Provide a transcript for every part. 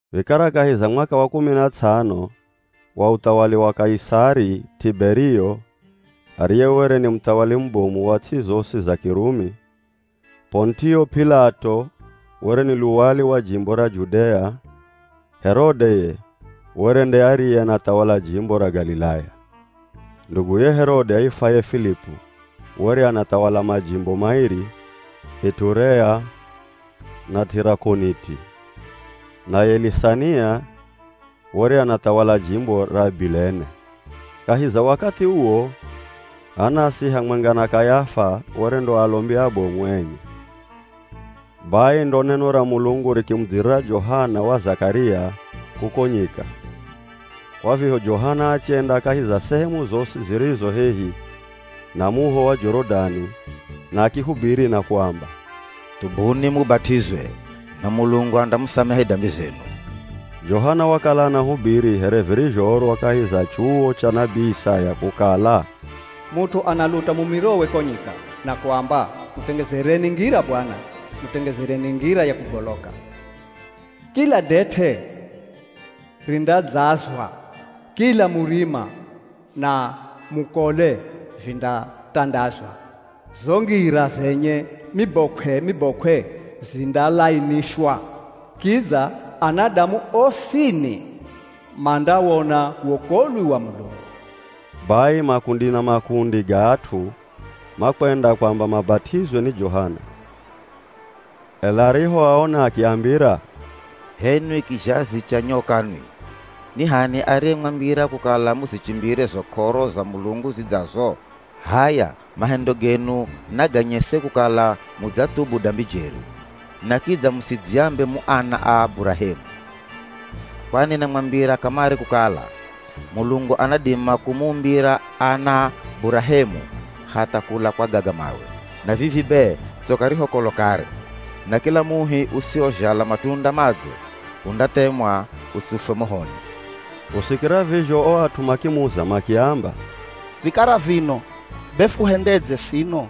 Vikara kahi za mwaka wa kumi na tsano wa uthawali wa Kaisari Tiberio, ariye were ni muthawali mubomu wa ts'i zosi za Kirumi, P'onitio P'ilato were ni luwali wa jimbo ra Judea, Herode ye, were nde ariye anathawala jimbo ra Galilaya. Nduguye Herode aifwaye Filipu were anathawala majimbo mairi, Iturea na Tirakoniti. Naye Lisania were anathawala jimbo ra Abilene. Kahi za wakathi uwo Anasi hamwenga na Kayafa were ndo alombi abomu enye. Bai ndo neno ra Mulungu rikimudzirira Johana wa Zakaria kuko nyika. Kwa vizho Johana achenda kahi za sehemu zosi zirizo hehi na muho wa Jorodani na akihubiri na kuamba, “Thubuni mubat'izwe, na Mulungu andamusamehe dambi zenu.” Johana wakala anahubiri here virizhoorwa kahi za chuwo cha nabii Isaya kukala, “Mut'u analuta mumirowe ko nyika na kuamba, ‘Mutengezereni ngira Bwana, Mutengezereni ngira ya kugoloka. Kila det'e rindadzazwa, kila murima na mukole vindatandazwa, zo ngira zenye mibokw'e-mibokw'e zindalainishwa. Kidza anadamu osini mandawona wokolwi wa Mulungu!’” Bai makundi na makundi ga at'u makwenda kwamba mabat'izwe ni Johana. Ela arihoaona akiambira, “H'enwi kizhazi cha nyoka nwi! Ni h'ani ariyemwambira kukala muzichimbire zo k'oro za Mulungu zidzazo? H'aya mahendo genu naganyese kukala mudzathubu dambi jeri. Na kidza musidziambe mu ana a Burahemu. Kwani namwambira kamare kukala, Mulungu anadima kumuumbira ana Burahemu hatha kula kwa gaga mawe! Na vivi be tsoka ri ho kolo kare, na kila muhi usiwozhala matunda madzo, undathemwa utsufwe mohoni.” Kusikira vizho o at'u makimuza makiamba, “Vikara vino be fuhendedze sino?”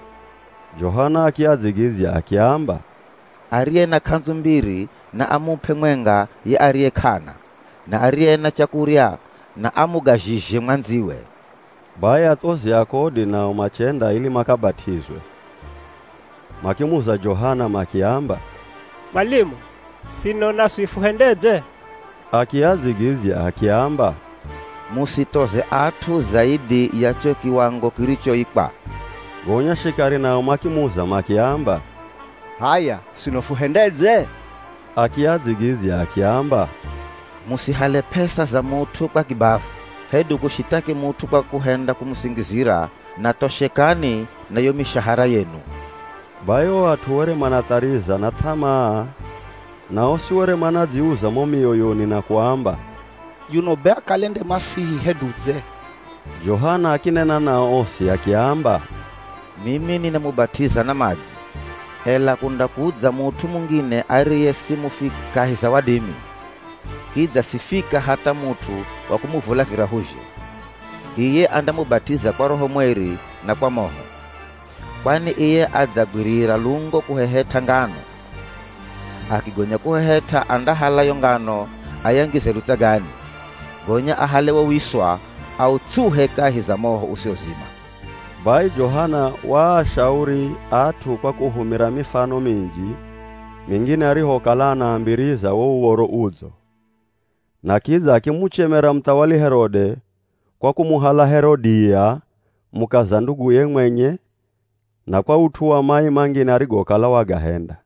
Johana akiadzigidzya akiamba, “Ariye na k'andzu mbiri na amup'e mwenga ye ariye k'ana, na ariye na chakurya na amugazhizhe mwandziwe.” Bai athozi a kodi nao machenda ili makabat'izwe. Makimuza Johana makiamba, “Mwalimu, sino naswi fuhendedze?” Akiadzigidzya akiamba, “Musithoze at'u zaidhi ya cho kiwango kirichoikwa.” Gonya shikari nao makimuza makiamba, “H'aya sino fuhendedze?” Akiadzigidzya akiamba, “Musihale p'esa za mut'u kwa kibavu, hedu kushithaki mut'u kwa kuhenda kumusingizira, na thoshekani na yo mishahara yenu.” Bai o at'u were manathariza na th'amaa na osi were manadziuza mo mioyoni na kuamba, “Yuno be akale nde ye Masihi hedu dze?” Johana akinena nao osi akiamba, “Mimi ninamubat'iza na madzi, ela kundakudza mut'u mungine ariye simufika kahi za wadimi, kidza sifika hatha mut'u wa kumuvula virahuzhe. Iye andamubat'iza kwa Roho Mweri na kwa moho. Kwani iye adzagwirira lungo kuhehet'a ngano. Akigonya kuhehet'a andahala yo ngano ayangize lutsagani, gonya ahale wo wiswa autsuhe kahi za moho usiwozima.” Bai Johana waashauri at'u kwa kuhumira mifano minji mingine arihokala anaambiriza wo Uv̱oro Udzo. Na kidza akimuchemera muthawali Herode kwa kumuhala Herodia mukaza nduguye mwenye na kwa ut'u wa mai mangine arigokala wagahenda.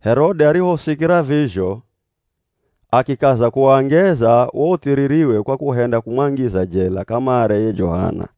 Herode arihosikira vizho akikaza kuwangeza wo uthiririwe kwa kuhenda kumwangiza jela kamare ye Johana.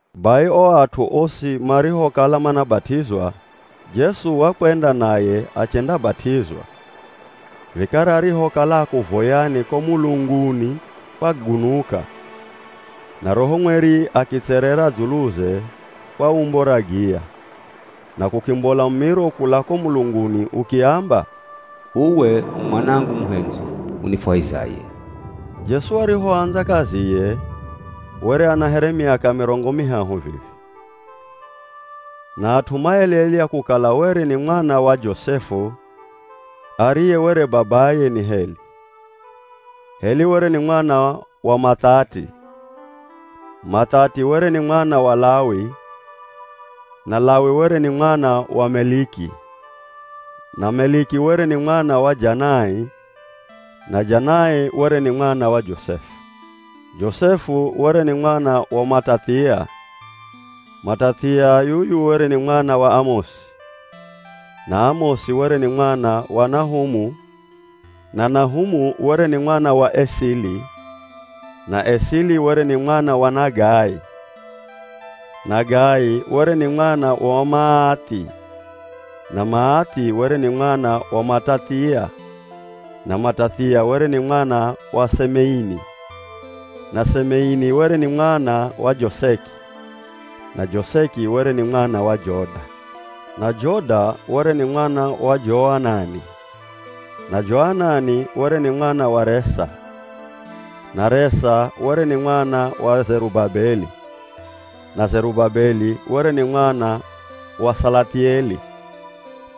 Bai o at'u osi marihokala manabat'izwa, Jesu wakwenda naye achendabat'izwa, vikara arihokala akuvoyani, ko mulunguni kwagunuka, na Roho Mweri akitserera dzuluze kwa umbo ra giya. Na kukimbola mumiro kula ko mulunguni ukiamba, “Uwe u Mwanangu muhendzwi, unifwahizaye.” Jesu arihoandza kaziye, were ana here miaka mirongo mihahu vivi, na at'u maelelya kukala were ni mwana wa Josefu ariye were babaye ni Heli. Heli were ni mwana wa Mathati, Mathati were ni mwana wa Lawi na Lawi were ni mwana wa Meliki na Meliki were ni mwana wa Janai na Janai were ni mwana wa Josefu. Josefu were ni mwana wa Matathia, Matathia yuyu were ni mwana wa Amosi, na Amosi were ni mwana wa Nahumu na Nahumu were ni mwana wa Esili na Esili were ni mwana wa Nagai. Nagai were ni mwana wa Maathi na Maathi were ni mwana wa Matathia na Matathia were ni mwana wa Semeini na Semeini were ni mwana wa Joseki na Joseki were ni mwana wa Joda, na Joda were ni mwana wa Joanani, na Joanani were ni mwana wa Resa na Resa were ni mwana wa Zerubabeli, na Zerubabeli were ni mwana wa Salathieli,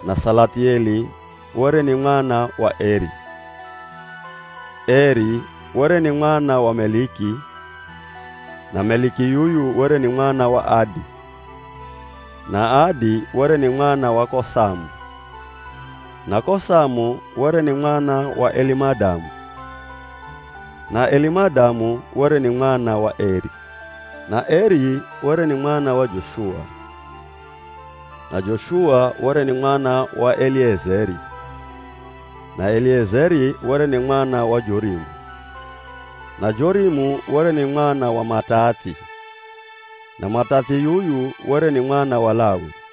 na Salathieli were ni mwana wa Eri. Eri were ni mwana wa Meliki, na Meliki yuyu were ni mwana wa Adi, na Adi were ni mwana wa Kosamu, na Kosamu were ni mwana wa Elimadamu na Elimadamu were ni mwana wa Eri, na Eri were ni mwana wa Joshua, na Joshua were ni mwana wa Eliezeri, na Eliezeri were ni mwana wa Jorimu, na Jorimu were ni mwana wa Matathi na Mathati yuyu were ni mwana wa Lawi.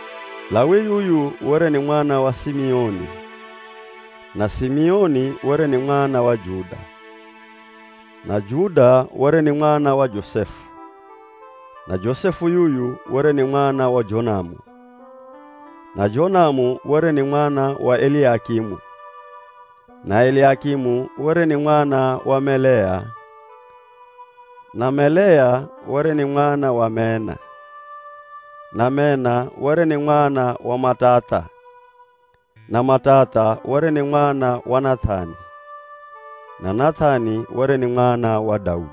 Lawi yuyu were ni mwana wa Simioni, na Simioni were ni mwana wa Juda, na Juda were ni mwana wa Josefu, na Josefu yuyu were ni mwana wa Jonamu, na Jonamu were ni mwana wa Eliakimu, na Eliakimu were ni mwana wa Melea, na Melea were ni mwana wa Mena, na Mena were ni mwana wa Matatha, na Matatha were ni mwana wa Nath'ani, na Nath'ani were ni mwana wa Daudi.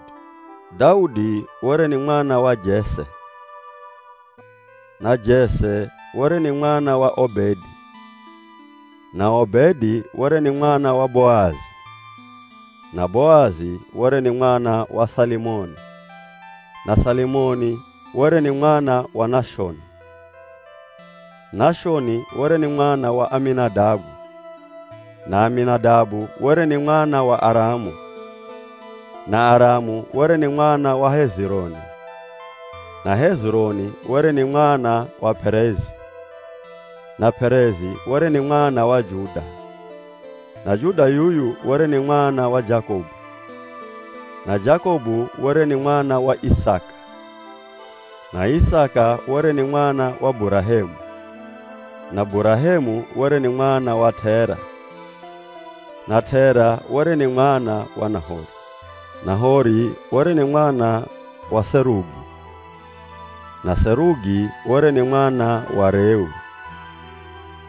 Daudi were ni mwana wa Jese, na Jese were ni mwana wa Obedi, na Obedi were ni mwana wa Boazi, na Boazi were ni mwana wa Salimoni, na Salimoni were ni mwana wa Nashoni. Nashoni were ni mwana wa Aminadabu, na Aminadabu were ni mwana wa Aramu, na Aramu were ni mwana wa Hezironi, na Hezironi were ni mwana wa P'erezi, na P'erezi were ni mwana wa Juda, na Juda yuyu were ni mwana wa Jakobu, na Jakobu were ni mwana wa Isaka, na Isaka were ni mwana wa Burahemu, na Burahemu were ni mwana wa T'era, na T'era were ni mwana wa Nahori. Nahori were ni mwana wa Serugi, na Serugi were ni mwana wa Reu,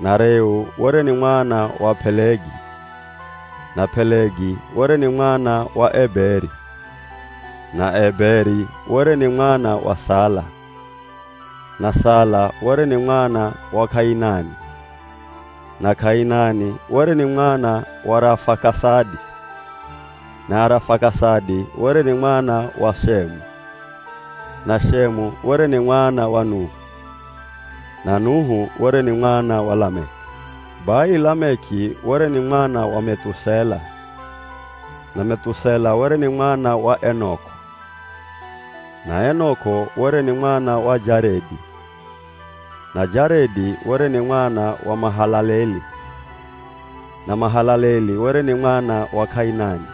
na Reu were ni mwana wa P'elegi, na P'elegi were ni mwana wa Eberi, na Eberi were ni mwana wa Sala, na Sala were ni mwana wa K'ainani na K'ainani were ni mwana wa Arafakasadi, na Arafakasadi were ni mwana wa Shemu, na Shemu were ni mwana wa Nuhu, na Nuhu were ni mwana wa Lameki. Bai Lameki were ni mwana wa Meth'usela, na Meth'usela were ni mwana wa Enok'o na Enok'o were ni mwana wa Jaredi, na Jaredi were ni mwana wa Mahalaleli, na Mahalaleli were ni mwana wa K'ainani,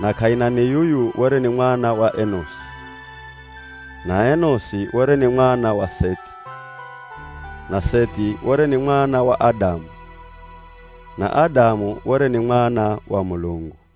na K'ainani yuyu were ni mwana wa Enosi, na Enosi were ni mwana wa Sethi, na Sethi were ni mwana wa Adamu, na Adamu were ni mwana wa Mulungu.